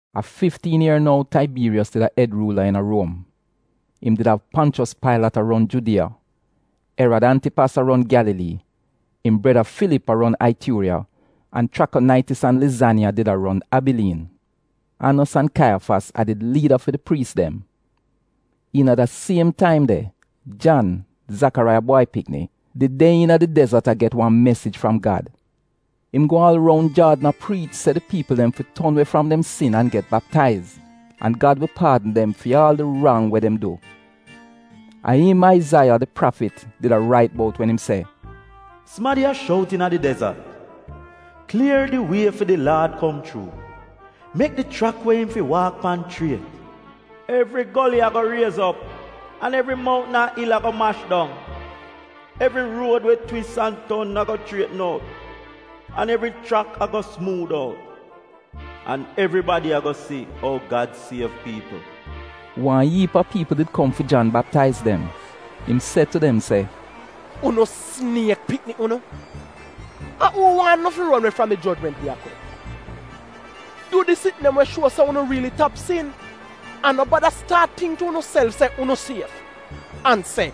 A fiftiin ier nou Taibiiriyos did a Ed Ruula iina Ruom, im did av Ponchos Pailat a ron Judiya, Erad Antipas a ron Gyalalii, im breda Filip a ron Aituuriya an Chrakonaitis an Lizaniya did a ron Abiliin. Anos an Kaiyafas a did liida fi di priis dem. Iina da siem taim de Jan, Zakaraiya bwai pikni, did de iina di dezot an get wan mesij fram Gad. Im go aal roun Jaadn a priich se di piipl dem fi ton we fram dem sin an get baptaiz, an Gad wi paadn dem fi aal di rang we dem du. A im Aizaiya, di prafit, did a rait bout wen im se: “Sumadi a shout iina di dezot, ‘Klier di wie fi di Laad kom chuu, mek di chrak we im fi waak pan chriet. Evri goli ago riez op, An evri moutn an il ago mash dong. Evri ruod we twis an ton ago chrietn out, an evri chrak ago sumuud out. An evribadi ago si ou Gad siev piipl.’” Wan iip a piipl did kom fi Jan baptaiz dem, im se tu dem se, “Unu siniek pikni unu! A uu waan unu fi ron we fram di jojment we a kom? Du di sitn dem we shuo se unu riili tap sin. An no bada staat tingk tu unuself se unu sief, an se,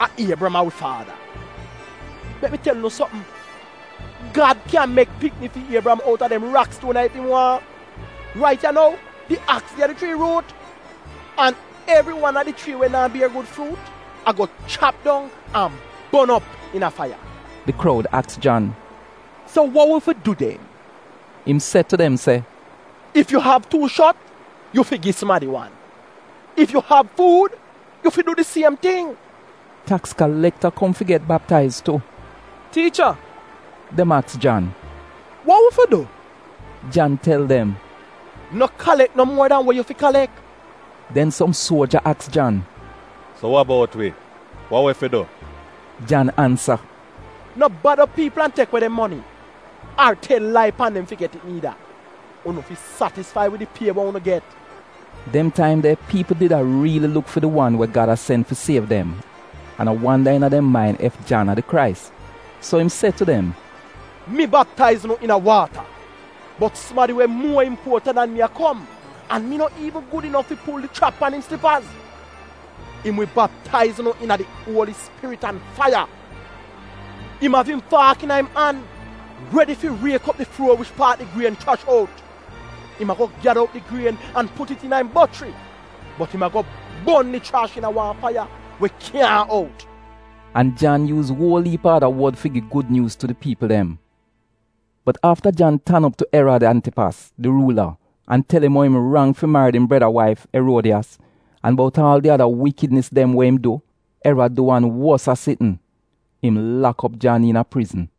‘A Iebriyam a wi faada.’ Mek mi tel unu sopm, Gad kyan mek pikni fi Iebriyam outa dem rakstuon ya ef im waahn! Rait ya nou di aks de a di chrii ruut. An evri wan a di chrii dem we naa bier gud fruut ago chap dong an bon op iina faiya.” Di kroud aks Jan, “So wa wi fi du den?” Im se tu dem se, “Ef yu av tuu shot yu fi gi sumadi wan an ef yu av fuud yu fi du di siem ting.” Taks kalekta kom fi get baptaiz tu. “Tiicha,” dem aks Jan, “wa wi fi du?” Jan tel dem, “No kalek no muo dan we yu fi kalek.” Den som suoja aks Jan, “So wa bout wi, wa wi fi du?” Jan ansa, “No bad op piipl an tek we dem moni ar tel lai pan dem fi get it niida. Unu fi satisfai wid di pie we unu get.” Dem taim de piipl did a riili luk fi di wan we Gad a sen fi siev dem, an a wanda iina dem main ef Jan a di Krais. So im se tu dem, “Mi baptaiz unu iina waata. Bot sumadi we muo impuotant dan mi a kom an mi no iivn gud inof fi pul di schrap pan im slipaz. Im wi baptaiz unu iina di Uoli Spirit an faiya. Im av im faak iina im an, redi fi riek op di fluor wich paat di grien chrash out. Im ago gyada op di grien an put it iina im bochri, bot im ago bon di chrash iina wan faiya we kyaahn out.” An Jan yuuz uol iip a ada wod fi gi gud nyuuz tu di piipl dem. Bot afta Jan tan op tu Erad Antipas, di ruula, an tel im ou im rang fi marid im breda waif, Eruodiyas, an bout aal di ada wikidnis dem we im du, Erad du wan wosa sitn, im lak op Jan iina prizn.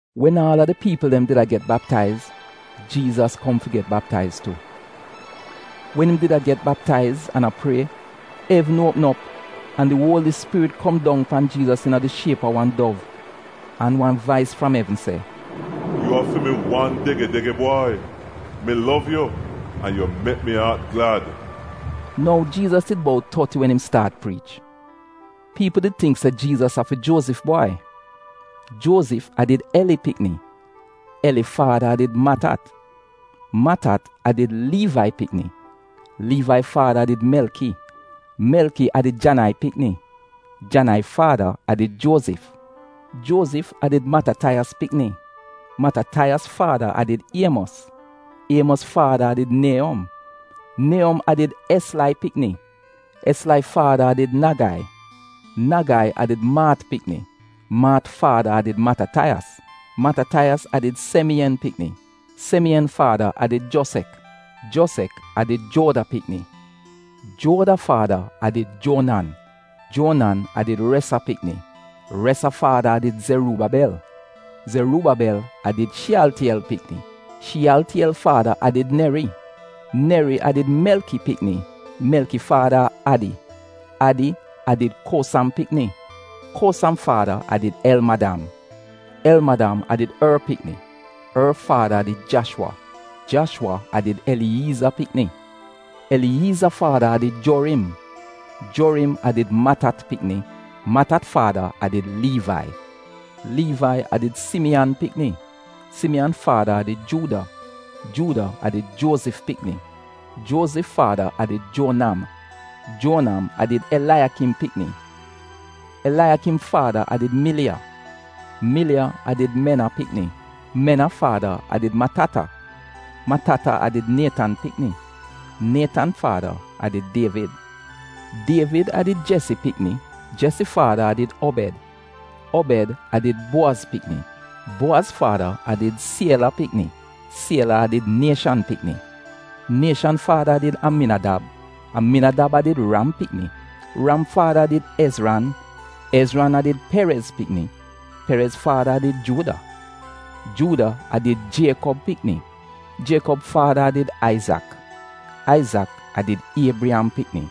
Wen aal a di piipl dem did a get baptaiz, Jiizas kom fi get baptaiz tu. Wen im did a get baptaiz an a prie evn uopm op, an di Uoli Spirit kom dong pan Jiizas iina di shiep a wan dov. An wan vais fram evn se, “Yu a fi mi wan dege-dege bwai, mi lov yu an yu mek mi aat glad.” Nou, Jiizas did bout toti wen im staat priich. Piipl did tingk se Jiizas a fi Juozif bwai. Juozif a did Eli pikni, Eli faada a did Matat, Matat a did Liivai pikni, Liivai faada a did Melki, Melki a did Janai pikni, Janai faada a did Juozif, Juozif a did Matataiyas pikni, Matataiyas faada a did Iemos, Iemos faada a did Nieyom, Nieyom a did Eslai pikni, Eslai faada a did Nagai, Nagai a did Maat pikni, Maat faada a did Matataiyas, Matataiyas a did Semiyen pikni, Semiyen faada a did Jozek, Jozek a did Juoda pikni Juoda faada a did Juonan, Juonan a did Resa pikni, Resa faada a did Zeruubabel, Zeruubabel a did Shiyaltiyel pikni, Shiyaltiyel faada a did Neri, Neri a did Melki pikni, Melki faada a Adi, Adi a did Kosam pikni, Kosam faada a did Elmadam, Elmadam a did Or pikni, Or faada a did Jashwa, Jashwa a did Eliyiiza pikni, Eliyiiza faada a did Jorim, Jorim a did Matat pikni, Mata faada a did Liivai Liivai a did Simiyan pikni, Simiyan faada a did Juuda, Juuda a did Juozif pikni, Juozif faada a did Juonam, Juonam a did Elaiyakim pikni, Elaiyakim faada a did Miliya, Miliya a did Mena pikni, Mena faada a did Matata, Matata a did Nietan pikni, Nietan faada a did Dievid, Dievid a did Jesi pikni, Jesi faada a did Obed, Obed a did Buowaz pikni, Buowaz faada a did Siela pikni, Siela a did Nieshan pikni, Nieshan faada a did Aminadab, Aminadab a did Ram pikni, Ram faada a did Ezran, Ezran a did Perez pikni, Perez faada a did Juuda, Juuda a did Jiekob pikni, Jiekob faada a did Aizak, Aizak a did Iebriyam pikni,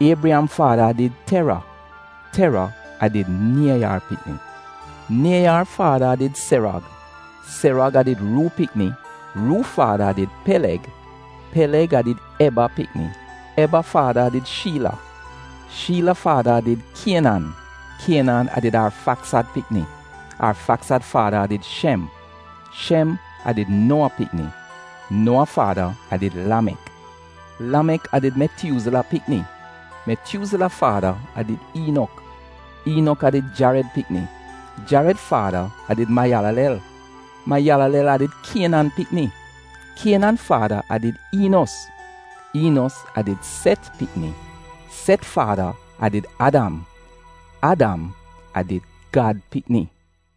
Iebriyam faada a did Tera, Tera a did Nieyar pikni, Nieyar faada a did Serog, Serog a did Ruu pikni, Ruu faada a did Peleg, Peleg a did Eba pikni, Eba faada a did Shiila, Shiila faada a did Kienan, Kienan a did Arfaksad pikni, Arfaksad faada a did Shem, Shem a did Nowa pikni, Nowa faada a did Lamek, Lamek a did Metyuuzila pikni, Metyuuzila faada a did Iinok, Iinok a did Jared pikni, Jared faada a did Mayalalel, Mayalalel a did Kienan pikni, Kienan faada a did Iinos, Iinos a did Set pikni, Set faada a did Adam. Adam a did Gad pikni.